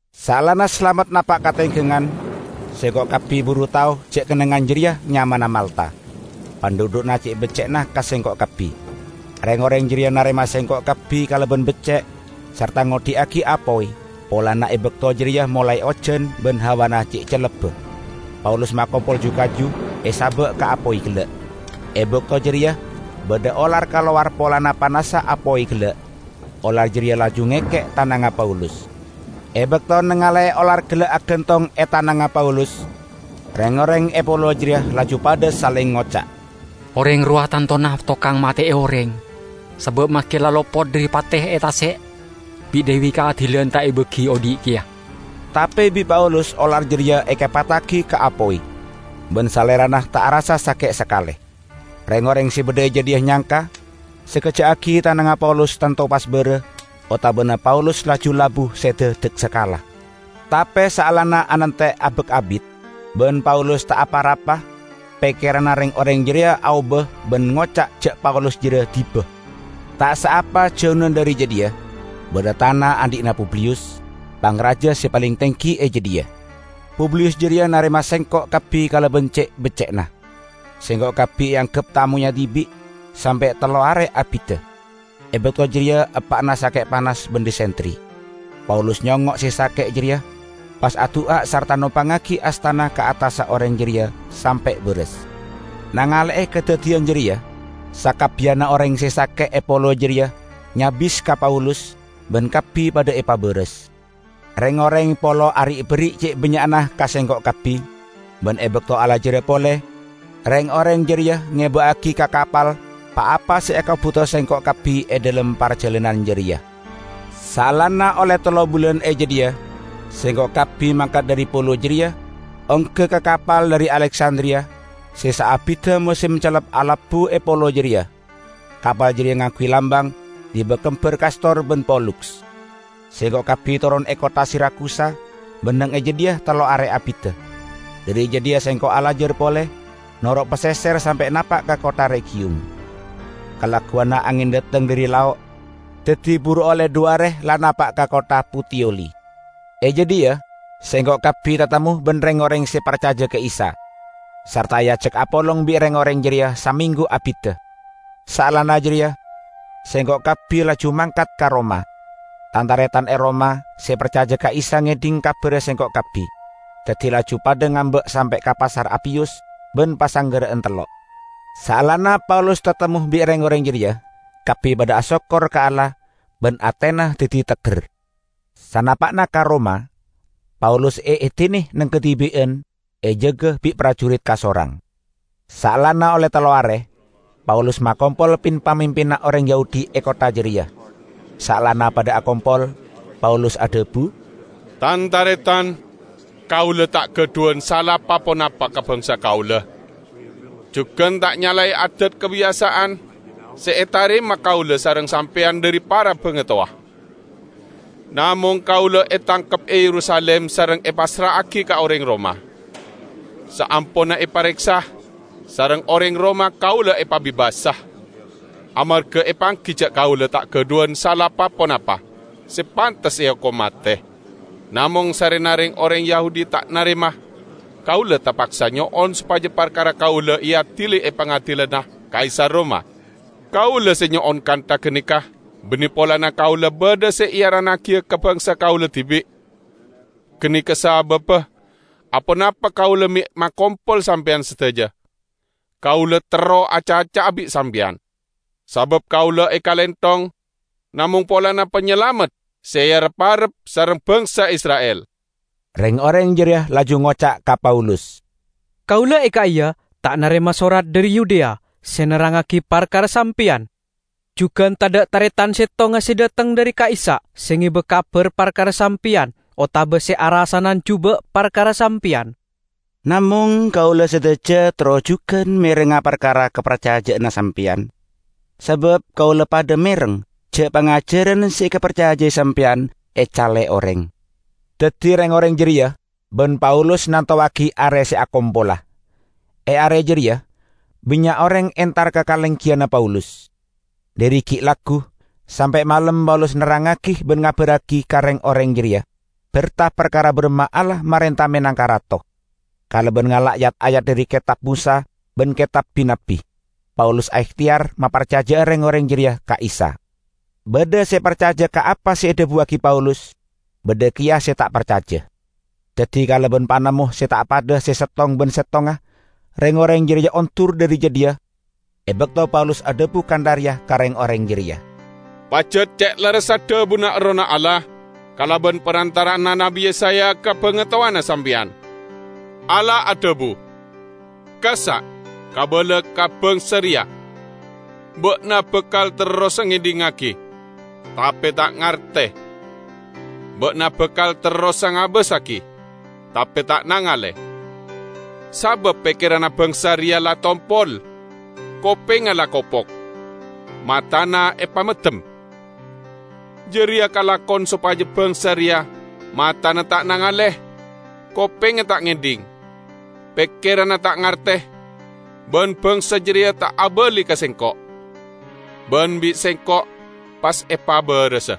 Saellana salamet napa' ka tenggangan, sengko' kabbi buru tao ja' kennengngan jareya nyamana Malta. Pandhudhu'na ce' becce'na ka sengko' kabbi. Reng-oreng jareya narema sengko' kabbi kalaban becce' sarta ngodhi'agi apoy polana e bakto jareya molae ojan ban hawana ce' cellebba. Paulus makompol ju-kaju, esaba' ka apoy gella'. E bakto jareya badha olar kalowar, polana panassa apoy gella', olar jareya laju ngekke' tanangnga Paulus. E bakto nangale'e olar gella' agantong e tanangnga Paulus, reng-oreng e polo jareya laju padha saleng ngoca', "Oreng rowa tantona tokang mate'e oreng, sabaâ maske la lopot dhari pate e tase', bi' Dewi Kaadilan ta' ebagi odhi' keya." Tape bi' Paulus olar jareya ekepattagi ka apoy, ban salerana ta' arassa sake' sakale. Reng-oreng se badha e jadhiya nyangka sakejja' aggi' tanangnga Paulus tanto pas bara, otabana Paulus laju labu seda daksakala. Tape saellana anante' abak abit, ban Paulus ta' apa- rapa, pekkeranna reng-oreng jareya aoba ban ngoca' ja' Paulus jareya diba. Ta' saapa jauna dhari jadhiya badha tana andhi'na Publiyus, pangraja se paleng tenggi e jadhiya. Publiyus jareya narema sengko' kabbi kalaban ce' becce'na, sengko' kabbi eanggep tamoyya dibi' sampe' tello are abidda. E bakto jareya eppa'na sake' panas ban disentri. Paulus nyongngo' se sake' jareya, pas adu'a sarta nompangngagi astana ka attassa oreng jareya, sampe' baras. Nangale'e kadaddiyan jareya, sakabbiyanna oreng se sake'e polo jareya nyabis ka Paulus, ban kabbi padha epabaras. Reng-oreng polo ari'-berri' ce' bannya'na ka sengko' kabbi, ban e bakto alajara pole, reng-oreng jareya ngeba'agi ka kapal pa-apa se ekabuto sengko' kabbi e dhalem parjalanan jareya. Saellana olle tello bulan e jadhiya, sengko' kabbi mangkat dhari polo jareya ongga ka kapal dhari Aleksandriya se saabidda mosem cellep alabbu e polo jareya. Kapal jareya ngangguy lambang "Diba Kembar Kastor ban Poluks". Sengko' kabbi toron e kottha Sirakusa ban neng e jadhiya tello are abidda. Dhari jadhiya sengko' alajar pole noro' paseser sampe' napa' ka kottha Regiyum. Kalagguwanna angen dhateng dhari lao', daddi buru olle dhu are la napa' ka kottha Putiyoli. E jadhiya sengko' kabbi tatemmo ban reng-oreng se parcaja ka Isa, sarta eajak apolong bi' reng-oreng jareya samenggu abidda. Saellana jareya sengko' kabbi laju mangkat ka Roma. Tan-taretan e Roma se parcaja ka Isa ngedhing kabarra sengko' kabbi, daddi laju padha ngamba' sampe' ka Pasar Apiyus ban Pasanggerra'an Tello'. Saellana Paulus tatemmo bi' reng-oreng jareya, kabbi padha asokkor ka Allah ban atena daddi tegger. Sanapa'na ka Roma, Paulus eedine neng kadibi'an, ejaga bi' parjurit kasorang. Saellana olle tello are, Paulus makompol pin-pamimpinna oreng Yahudi e kottha jareya. Saellana padha akompol, Paulus adhabu, "Tan-taretan¡ Kaula ta' gadhuwan sala pa-ponapa ka bangsa kaula, jugan ta' nyalae adaä kabiyasa'an se etarema kaula sareng sampeyan dhari para bangatowa. Namong kaula etangkep e Yerusalim sareng epassra'agi ka oreng Roma. Saamponna epareksa, sareng oreng Roma kaula epabebasa, amarga epanggi ja' kaula ta' gadhuwan sala pa-ponapa se pantes eokom mate. Namong sarrena reng-oreng Yahudi ta' narema, kaula tapaksa nyo'on sopaja parkara kaula eadili e pangadilanna Kaisar Roma. Kaula se nyo'on kantha ganeka banne polana kaula badha se earannagiya ka bangsa kaula dibi'. Ganeka sababba aponapa kaula me' makompol sampeyan sadaja» kaula terro acaca'a bi' sampeyan. Sabaâ kaula ekalenthong namong polana Panyalamet se erep-arep sareng bangsa Isra'il." Reng-oreng jareya laju ngoca' ka Paulus, "Kaula e ka'iya ta' narema sorat dhari Yudea se nerrangngagi parkara sampeyan. Jugan tadha' taretan settonga se dhateng dhari ka'issa' se ngeba kabar parkara sampeyan otaba se arasanan juba' parkara sampeyan. Namong kaula sadaja terro jugan merengnga parkara kaparcaja'anna sampeyan, sabab kaula padha mereng ja' pangajaran se ekaparcajai sampeyan ecale oreng." Daddi reng-oreng jareya ban Paulus nantowagi are se akompola. E are jareya bannya' oreng entar ka kalenggiyanna Paulus. Dhari gi' laggu sampe' malem Paulus nerrangngagi ban ngabarragi ka reng-oreng jareya berta parkara baramma Allah marenta menangka Rato. Kalaban ngala' yat-ayat dhari Ketab Mosa ban Ketab Bi-nabbi, Paulus aehteyar maparcaja'a reng-oreng jareya ka Isa. Badha se parcaja ka apa se edhabuwagi Paulus, badha keya se ta' parcaja. Daddi kalaban panemmo se ta' padha se settong ban settongnga reng-oreng jareya ondur dhari jadhiya e bakto Paulus adhabu kantha reya ka reng-oreng jareya, "Pajat ce' lerressa dhabuna Errohna Allah kalaban parantara'anna Nabbi Yesaya ka bangatowana sampeyan! Allah adhabu, 'Kassa' kabala ka bangsa reya: Ba'na bakal terrosa ngedhingngagi, tape ta' ngarte; ba'na bakal terrosa ngabbassagi, tape ta' nangale. Sabab pekkeranna bangsa reya la tompol, kopengnga la kopok, matana epameddem. Jareya kalakon sopaja bangsa reya matana ta' nangale, kopengnga ta' ngedhing, pekkeranna ta' ngarte, ban bangsa jareya ta' abali ka Sengko', ban bi' Sengko' pas epabarasa.' "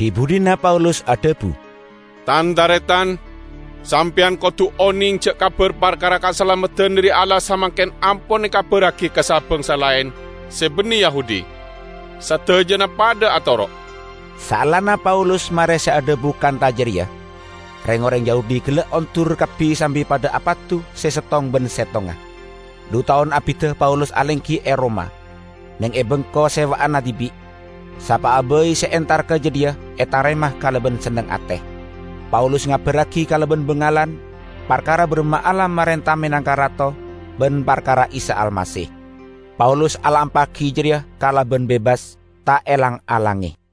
Dhi-budhina Paulus adhabu, "Tan-taretan, sampeyan kodu oneng ja' kabar parkara kasalameddan dhari Allah samangken ampon ekabarragi ka sa-bangsa laen se banne Yahudi. Sadajana padha atoro'!" [ Saellana Paulus mare se adhabu kantha jareya, reng-oreng Yahudi gella' ondur kabbi sambi padha apadu se settong ban settonga.] Dhu taon abidda Paulus alenggi e Roma, neng e bengko sewa'anna dibi'. Sapa'a bai se entar ka jadhiya etarema kalaban senneng ate. Paulus ngabarragi kalaban bangalan parkara baramma Allah marenta menangka Rato ban parkara Isa Almasih. Paulus alampa'agi jareya kalaban bebas, ta' elang-alange.